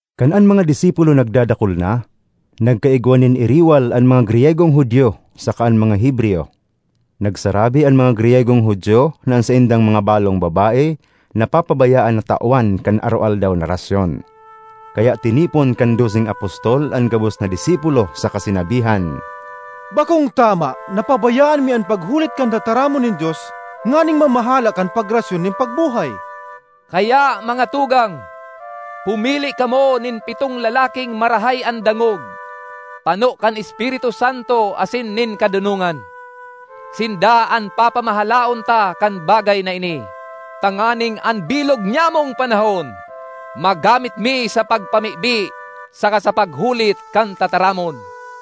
Kan an mga disipulo nagdadakul na, nagkaigwa nin iriwal an mga Griyegong Judio saka an mga Hebreyo. Nagsarabi an mga Griyegong Judio na an saindang mga balong babae napapabayaan na tawan kan sa aroaldaw na rasyon. Kaya tinipon kan doseng apostol an gabos na disipulo saka sinabihan, “Bakong tama na pabayaan mi an paghulit kan tataramon nin Dios nganing mamahala kan pagrasyon nin pagbuhay. Kaya, mga tugang, pumili kamo nin pitong lalaking marahay an dangog, pano kan Espiritu Santo asin nin kadonongan; sinda an papamahalaon ta kan bagay na ini, tanganing an bilog nyamong panahon magamit mi sa pagpamibi saka sa paghulit kan tataramon.”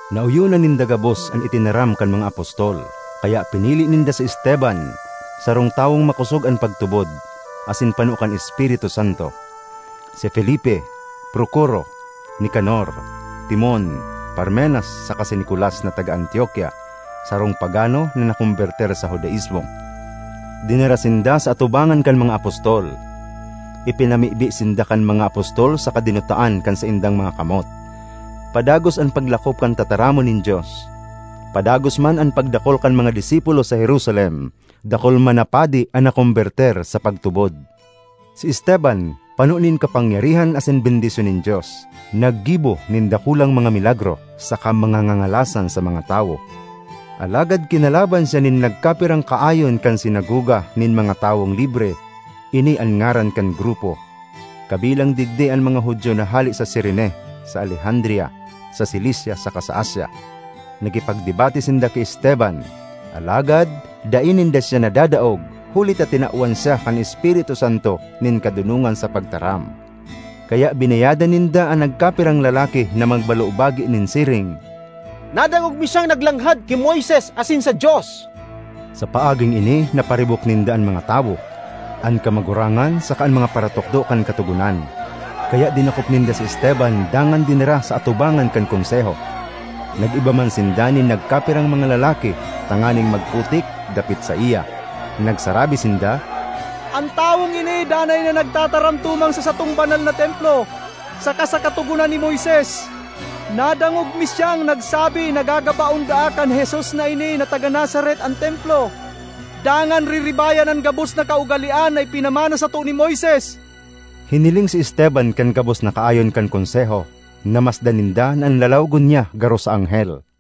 Naoyonan ninda gabos an itinaram kan mga apostol, kaya pinili ninda si Esteban, sarong tawong makosog an pagtubod asin pano kan Espiritu Santo; si Felipe, Procoro, Nicanor, Timon, Parmenas saka si Nicolas na taga Antiokia, sarong pagano na nakombertir sa Judaismo. Dinara sinda sa atubangan kan mga apostol; ipinamibi sinda kan mga apostol saka dinutaan kan saindang mga kamot. Padagos an paglakop kan tataramon nin Dios. Padagos man an pagdakul kan mga disipulo sa Jerusalem; dakul man na padi an nakombertir sa pagtubod. Si Esteban, pano nin kapangyarihan asin bendisyon nin Dios, naggibo nin dakulang mga milagro saka mga ngangalasan sa mga tawo. Alagad kinalaban siya nin nagkapirang kaayon kan sinagoga nin mga Tawong Libre (ini an ngaran kan grupo); kabilang digdi an mga Judio na hale sa Cirene, sa Alejandria, sa Cilicia saka sa Asia. Nakipagdebate sinda ki Esteban, alagad dai ninda siya nadadaog huli ta tinawan siya kan Espiritu Santo nin kadonongan sa pagtaram. Kaya binayadan ninda an nagkapirang lalaki na magbalobagi nin siring, “Nadangog mi siyang naglanghad ki Moises asin sa Dios!” Sa paaging ini naparibok ninda an mga tawo, an kamagurangan saka an mga paratukdo kan Katogonan. Kaya dinakop ninda si Esteban dangan dinara sa atubangan kan Konseho. Nag-iba man sinda nin nagkapirang mga lalaki tanganing magputik dapit saiya. Nagsarabi sinda, “An tawong ini danay na nagtataram tumang sa satong banal na Templo saka sa Katogonan ni Moises. Nadangog mi siyang nagsabi na gagabaon daa kan Jesus na ini na taga Nazaret an Templo, dangan riribayan an gabos na kaugalean na ipinamana sato ni Moises!” Hiniling si Esteban kan gabos na kaayon kan Konseho; namasdan ninda na an lalawogon niya garo sa anghel.